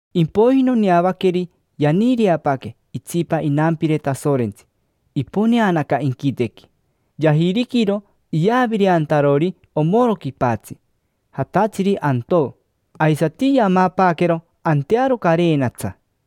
Impoiji noneavaqueri yaniireapaaque itsipa inampire Tasorentsi, iponeanaca inquitequi. Yajiriquiro iyavireantarori omoro quipatsi, jatatsiri antoo. Aisati yamapaaquero antearo carenatsa.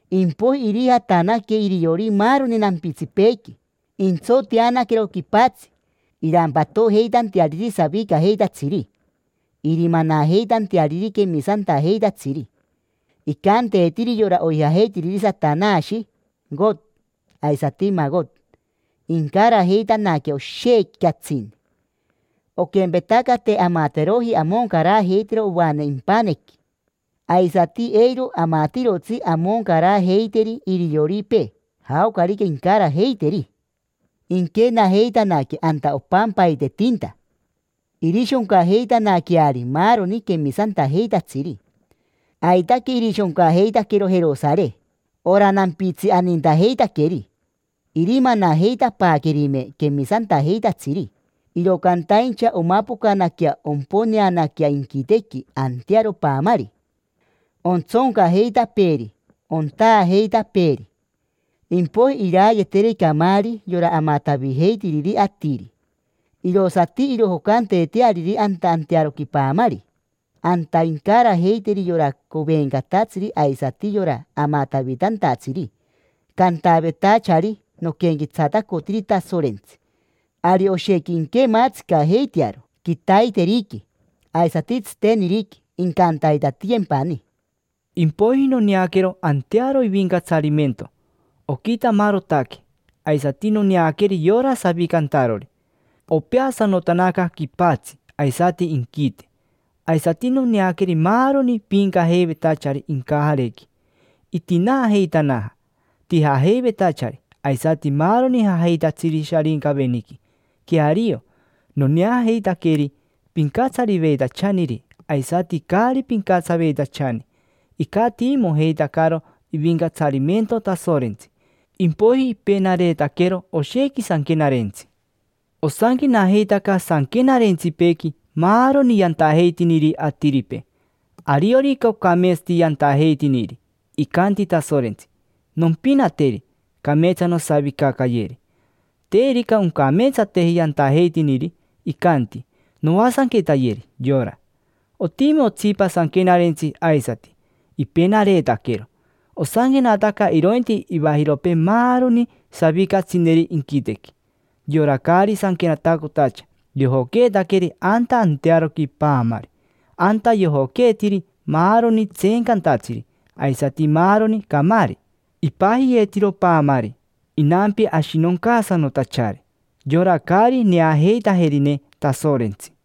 Impoiji irijatanaque iriori maaroni nampitsipeequi, intsoteanaquero quipatsi, irampatojeitanteariri savicajeitatsiri irimanajeitanteariri quemisantajeitatsiri. Icanteetiri yora oijajeitiriri Satanashi: Co, aisati Maco. Incarajeitanaque oshequi catsini. Oquempetaca te amateroji amoncarajeitero ovane impanequi, aisati eiro amatirotsi amoncarajeiteri irioripee, jaocarica incarajeiteri. Inquenajeitanaque anta opampaitetinta, irishoncajeitanaqueari maaroni quemisantajeitatsiri, aitaque irishoncajeitaquero Jerosare: ora nampitsi anintajeitaqueri. Irimanajeitapaaquerime quemisantajeitatsiri, iro cantaincha omapocanaquea omponeanaquea inquitequi antearo paamari, ontsoncajeitapeeri; ontaajeitapeeri, pomein. Impoiji irayeeteri camaari, yora amatavijeitiriri atiri, irosati irojocanteeteariri anta antearoqui paamari. Anta incarajeiteri yora covencatatsiri aisati yora amatavitantatsiri, cantavetachari: “Noquenquetsatacotiri Tasorentsi”. Ari oshequi inquemaatsicajeitearo: quitaiteriqui, aisati tsiteniriqui; incantaitatiyempani. Impoiji noneaquero antearo ivincatsarimento, oquitamarotaque; aisati noneaqueri yora savicantarori. Opeasanotanaca quipatsi aisati inquite, maani. Aisati noneaqueri maaroni piincajeivetachari incajarequi. Itinaajeitanaja tijajeivetachari aisati maaroni jajeitatsiri Sharincaveniqui. Queario, noneajeitaqueri: pincatsariveitachaniri aisati caari pincatsaveitachani, icatiimojeitacaro ivincatsarimento Tasorentsi. Impoiji ipenareetaquero oshequi sanquenarentsi. Osanquenajeitaca sanquenarentsipeequi maaroni yantajeitiniri atiripee. Ariorica ocameetsati yantajeitiniri, icanti Tasorentsi: “Nompinateri, cameetsa nosavicacayeri”. Terica oncameetsateji yantajeitiniri, icanti: “Noasanquetayeri yora”. Otimi otsipa sanquenarentsi aisati, ipenareetaquero. Osanquenataca irointi ivajiropee maaroni savicatsineri inquitequi. Yora caari sanquenatacotacha yojoqueetaqueri anta antearoqui paamari: anta yojoqueetiri maaroni tseencantatsiri aisati maaroni camaari. Ipajiyeetiro paamari Inampi Ashinoncaasanotachari: yora caari neajeitajerine Tasorentsi.